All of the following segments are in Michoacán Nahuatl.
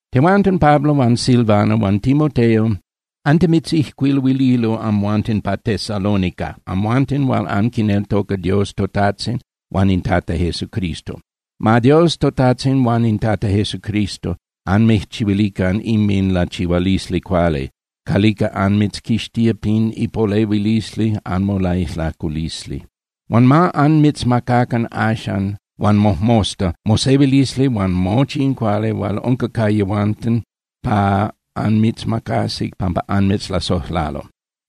Tehuanten Pablo huan Silvano huan Timoteo antimitzijcuiluililo amhuanten pa Tesalónica, amhuanten hual anquineltoca Dios toTajtzin huan in Tata Jesucristo. Ma Dios toTajtzin huan in Tata Jesucristo anmijchihuilican inminlachihualisli cuali calica anmitzquixtía pin ipolehuilisli anmolaijlaculisli. Huan ma anmitzmacacan axan huan mojmosta mosehuilisli huan mochi in cuali hual unca ca yehuanten pa anmitzmacasi pampa anmitzlasojlalo.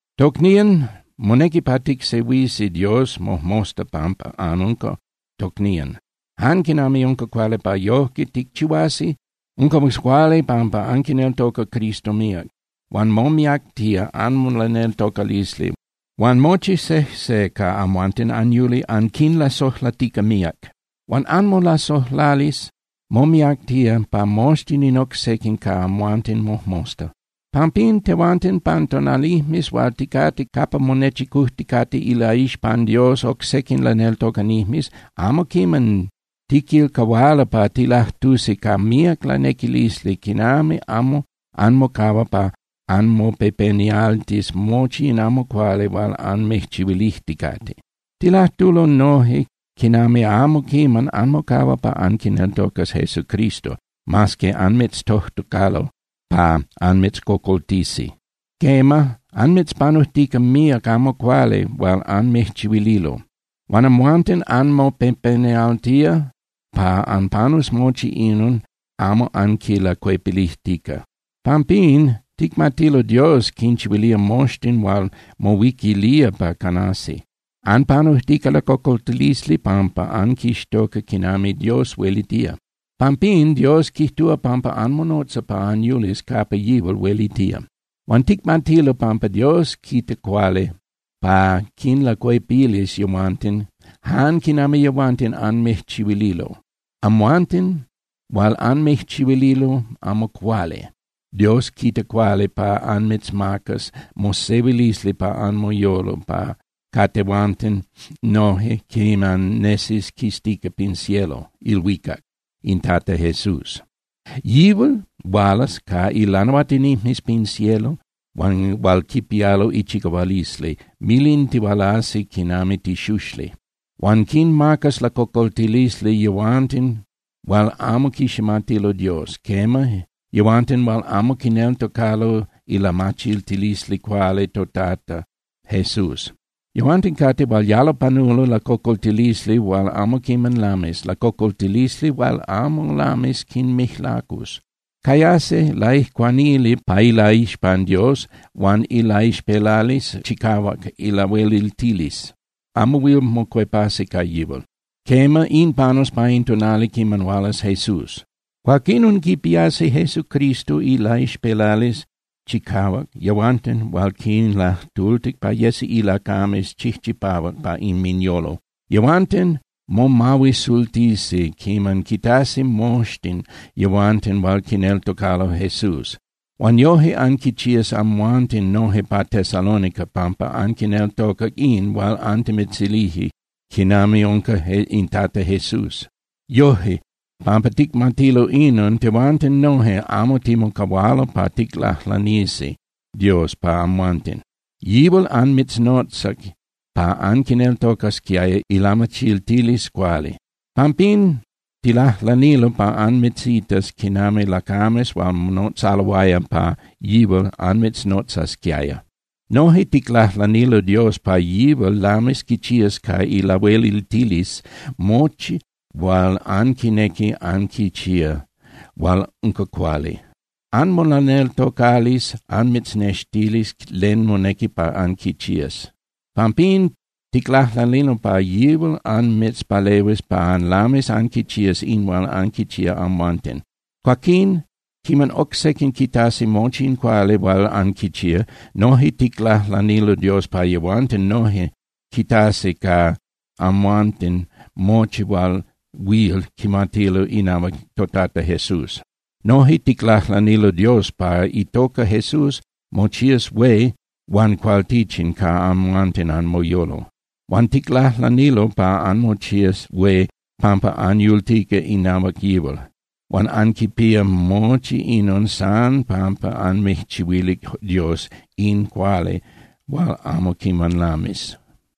Tocnían, monequi pa ticsehuisi Dios mojmosta pampa anunca tocnían, jan quinami unca cuali pa yojque ticchihuasi. Unca cuali pampa anquineltoca Cristo míac, huan momiactía anmolaneltocalisli. Huan mochi sejse ca amhuanten anyuli anquinlasojlatica míac. Huan anmolasojlalisli momiactía pa moxtin in oc sequin ca amhuanten mojmosta. Pampín, tehuanten, pan tonalijmes hual ticate capa monechicujticate ilaixpan Dios oc sequin laneltocanijmes, amo quiman tiquilcahualo pa tilajtusi ca míac lanequilisli quinami amo anmocahua pa anmopepenialtis mochi in amo cuali hual anmijchihuilijticate. Tilajtulo noje quinami amo quiman anmocahua pa anquineltocas Jesucristo, mas que anmitztojtocalo pa anmitzcocoltisi. Quema, anmitzpanujtica míac amo cuali hual anmijchihuililo. Huan amhuanten anmopepenialtía pa anpanus mochi inon amo anquinlacuepilijtica. Pampín, ticmatilo Dios quinchihuilía moxtin hual mohuiquilía pa canasi. Anpanujtica lacocoltili pampa anquixtoca quinami Dios huelitía. Pampín Dios quijtúa pampa anmonotza pa anyulis capa yihual huelitía. Huan ticmatilo pampa Dios quita cuali pa quinlacuepilis yehuanten jan quinami yehuanten anmijchihuililo. Amhuanten hual anmijchihuililo amo cuali, Dios quita cuali pa anmitzmacas mosehuilisli pa anmoyolo ca tehuanten noje quiman nesis quistica pin cielo (ilhuicac) in Tata Jesús. Yihual hualas ca ilanahuatinijmes pin cielo hual quipialo ichicahualisli, milintihualasi quinami tixuxli. Huan quinmacas lacocoltilisli yehuanten hual amo quiximatilo Dios, quema, yehuanten hual amo quineltocalo ilamachiltilisli cuali toTata Jesús. Yehuanten cate hual yalo panulo lacocoltilisli hual amo quiman lamis, lacocoltilisli hual amo lamis quinmijlacus. Cayasi laijcuanili pa ilaixpan Dios huan ilaixpelalisli chicahuac ilahueliltilisli, amo huil mocuepasi ca yihual. Quema, in panus pa in tonali quiman hualas Jesús. Cuaquinon quipiasi Jesucristo ilaixpelalisli chicahuac yehuanten hual quinlajtultic pa yesi ilacames chijchipahuac pa inminyolo. Yehuanten momahuisultisi quiman quitasi moxtin yehuanten hual quineltocalo Jesús. Huan yoje anquichías amhuanten noje pa Tesalónica pampa anquineltocac in hual antimitzilije quinami unca in Tata Jesús. Yoje, pampa ticmatilo inon, tehuanten noje amo timocahualo pa ticlajlanisi Dios pa amhuanten. Yihual anmitznotzac pa anquineltocasquiaya ilamachiltilisli cuali. Pampín ticlajlanilo pa anmitzitas quinami lacames hual monotzaloaya pa yihual anmitznotzasquiaya. Noje ticlajlanilo Dios pa yihual lamis quichías ca ilahueliltilisli mochi hual anquinequi anquichía hual unca cuali. Anmolaneltocalisli anmitznextilis len monequi pa anquichías. Pampín ticlajlanilo pa yihual anmitzpalehuis pa anlamis anquichías in hual anquichía amhuanten. Cuaquín, quiman oc sequin quitasi mochi in cuali hual anquichía, noje ticlajlanilo Dios pa yehuanten noje quitasi ca amhuanten mochi hual huil quimatilo inahuac toTata Jesús. Noje ticlajlanilo Dios pa itoca Jesús mochías hué huan cualtichin ca amhuanten anmoyolo. Huan ticlajlanilo pa anmochías hué pampa anyultica inahuac yihual. Huan anquipía mochi inon san pampa anmijchihuilic Dios in cuali hual amo quiman lamis.